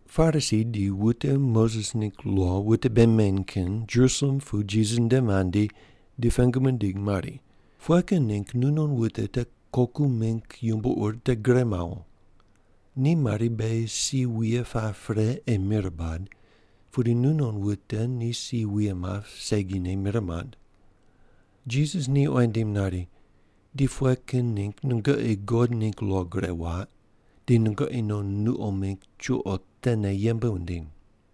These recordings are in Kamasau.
Parisi di wute Moses ningg lo wute bei meny kin Jerusalem pu Jisas nde mandi di pengu mindig mari, “Pughe kin ningg nunon wute te koku mingg yumbo ur te gure mawo? Ni mari, beghi si wuye pap pre ei mir bad, pudi nunon wute ni si wuye map segine mir mand.” Jisas ni oyi nindim nari, “Di pughe kin ningg nungoqi God ningg lo gure waq, di nungoqi non nuqo mingg chuqo tene yembe wundiny?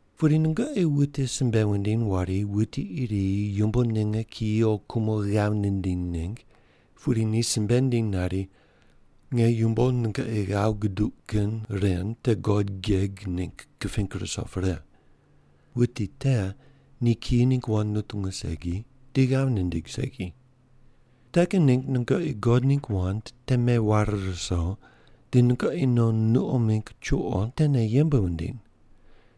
Pudi nungoqi wute simbe wundiny wari wuti iri yumbo ninge kiyi o kumo ghav nindiny ningg, pudi ni simbe nindiny nari, ‘Nge yumbo nungoqi ghav guduq kin ren te God geg ningg kiping ruso pre.’ Wuti te ni kiyi ningg wand nutungu segi di ghav nindig segi. Te kin ningg nungoqi God ningg wand te meware ruso di nungoqi non nuqo mingg chuqo tene yembe wundiny.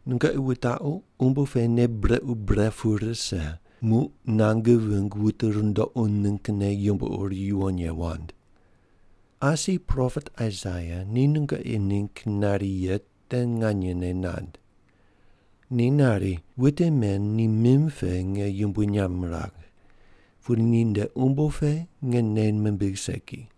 Nungoqi wutaqu umbo pe nei brequ bre pu rise muq nange vingg wute rundoqu ninggne yumbo ur yuwon ye wand. Asi propet Aisaia ni nungoqi ningg nari ye te nganyene nand. Ni nari, ‘Wute men ni mim pe nge yumbui nyamb miragh, pudi ninde umbo pe nge nei mimbigh segi.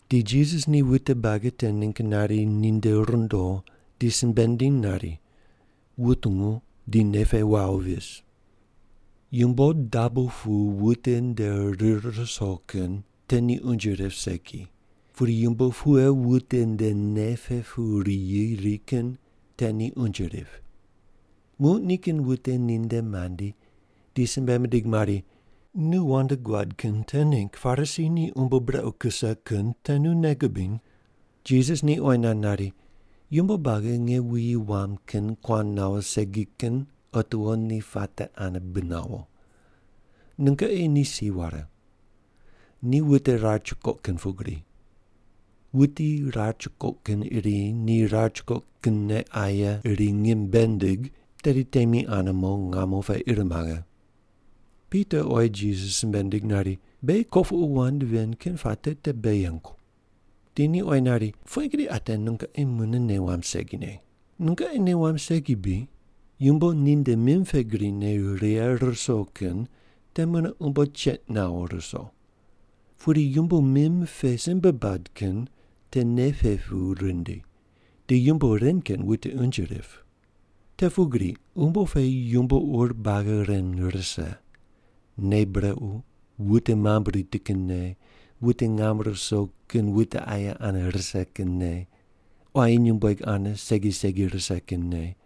Di Jisas ni wute buagi te ningg nari ninde rundo di simbe nindiny nari, “Wutungu di nei pe wawo vis. Yumbo dabo pu wuti nde rir ruso kin te ni unje rip segi, pudi yumbo pughe wuti nde nei pe pu riyi ri kin te ni unje rip.” Muq nikin wute ninde mandi di simbe mindig mari, “Nu wand guad kin te ningg Parisi ni umbo brequ kuse kin te nu nei gubiny?” Jisas ni oyi nand nari, “Yumbo buagi nge wuyi wam kin kuan nawo segi kin otiwo ni puate ane bi nawo. Nungoqi ni si ware. Ni wute rar chukoq kin pugri. Wuti rar chukoq kin iri ni rar chukoq kinne aye iri ngim bei nindig, tedi temi ane mo ngamo pe ir maghe.” Pita oyi Jisas simbe nindig nari, “Beghi kopuqu wand ven kin puate te bei yengu.” Di ni oyi nari, “Pughe gri ate nungoqi mune nei wamb segine? Nungoqi nei wamb segi bri, yumbo ninde mim pe gri ne righe ruso kin te mune umbo che nawo ruso. Pudi yumbo mim pe simbe bad kin te nei pe pu rindi, di yumbo ren kin wuti unje rip. Te pugri umbo pe yumbo ur buagi ren rise: nei brequ, wute mamb riti kin nei, wute ngam ruso kin wute aye ane rise kin nei, quayi nyumbueg ane segi segi rise kin nei,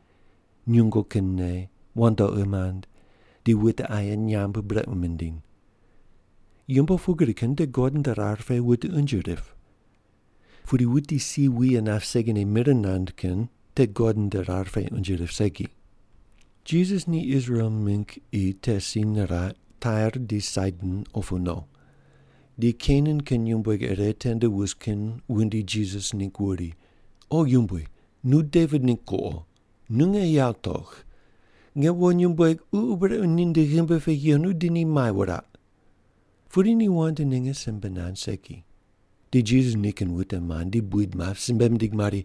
nyungu kin nei, wandoqi mand, di wute aye nyamb brequ mindiny. Yumbo pugri kin te God nde rar pe wute unje rip. Pudi wuti si wuye nap segine mir nand kin te God nde rar pe unje rip segi.” Jisas ni Israel mingg qi te si niraq, Tair di Saidon opu no. Di Kenan kin nyumbueg ire tende wus kin wundi Jisas ningg wuri, “O yumbui, nu Devit ningg kuqo, nu nge yawo togh. Nge wo nyumbueg ququ brequ ninde ghimbi pe yenu di ni mai wuraq.” Pudi ni wand ninge simbe nand segi. Di Jisas nikin wute mandi buid map simbe mindig mari,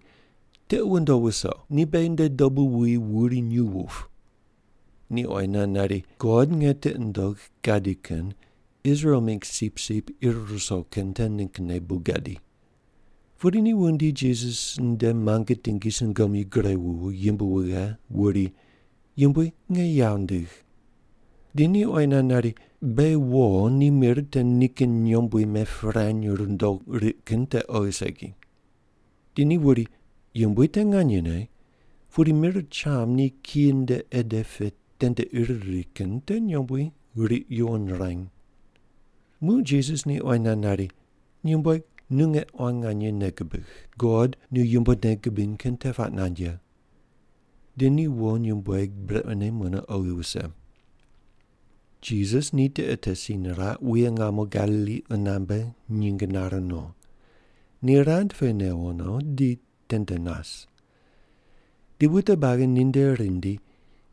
“Tiqi ndow wuso, ni beghi nde dobu wuwi wuri nyuw wup.” Ni oyi nand nari, “God nge tiqi nundogh gadi kin Israel mingg sipsip ir ruso kin te ninggne bu gadi.” Pudi ni wundi Jisas nde muange tingi sungomyu gure wuwo yimb wughe wuri, “Yumbui, nge ghav ndigh.” Di ni oyi nand nari, “Beghi wo ni mir te nikin nyombui mepirany rundo riq kin te oghi segi.” Di ni wuri, “Yumbui, te nganyene, pudi mir cham ni kiyi nde ede pe tende ir ri kin te nyombui riq yuwon ruany.” Muq Jisas ni oyi nand nari, “Nyumbueg, nu nge quan nganye nei gubigh! God nu yumbo nei gubiny kin te puaq nand ye.” Di ni wo nyumbueg brequne mune oghi wuse. Jisas ni tiqe te si niraq, wuye ngamo Galili qunambe nyinge nare no. Ni rand pe newo no, di tende nas. Di wute buagi ninde rindi,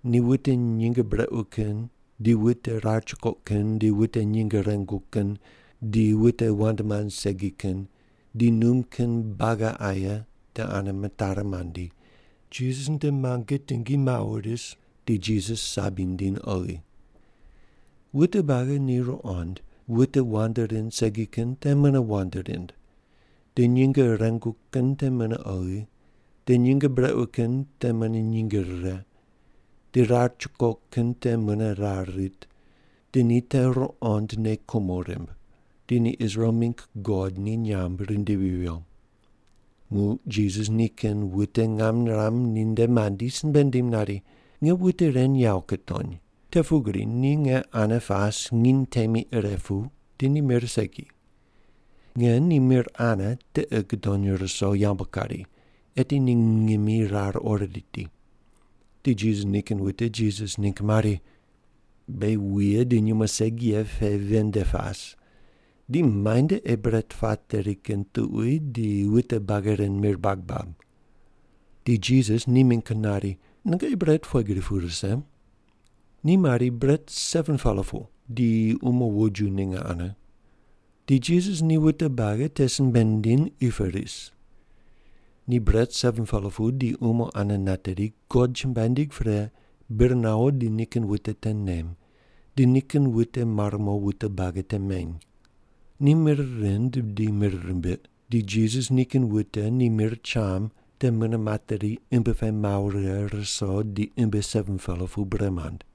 ni wute nyinge brequ kin, di wute rar chukoq kin, di wute nyinge rengu kin, di wute wand mand segi kin, di num kin buagi aye te ane mitari mandi, Jisas nde muange tingi mawo ris, di Jisas sabi nindiny oghi. Wute buagi ni ruqond, wute wand rind segi kin te mune wand rind, di nyinge rengu kin te mune oghi, di nyinge brequ kin te mune nyinge rire, di rar chukoq kin te mune rar rit, di ni te ruqond nei kumo rimb. Di ni Israel mingg God ni nyamb rindivi viyo. Muq Jisas nikin wute ngam niram ninde mandi simbe nindim nari, “Nge wute ren yawo kutony, te pugri ni nge ane pas nginy temi ire pu, di ni mir segi. Nge ni mir ane tiqi gudony ruso yambu kari, eti ni ngimi rar ori riti.” Di Jisas nikin wute Jisas ningg mari, “Beghi wuye di nyumo segi ye pe ven nde pas, di muainde ei bret pateri kin tuqui di wute buagi ren mir bag bab?” Di Jisas ni mingg nari, “Nungoqi bret pughe gri pu rise?” Ni mari, “Bret 7-pela pu, di umo woju ninge ane.” Di Jisas ni wute buagi te simbe nindiny qi pe ris. Ni bret 7-pela pu di umo ane nateri, God chumbuai nindig pre, bir nawo di nikin wute te nem, di nikin wute mare mo wute buagi te meny. Ni mir rind di mir rimbiq, di Jisas nikin wute ni mir cham te mune materi imbi pe mawo righe ruso di imbi 7-pela pu bre mand.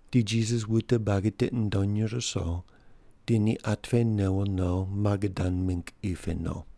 Di Jisas wute buagi tiqi nundony ruso, di ni at pe newo no Magadan mingg qi pe no.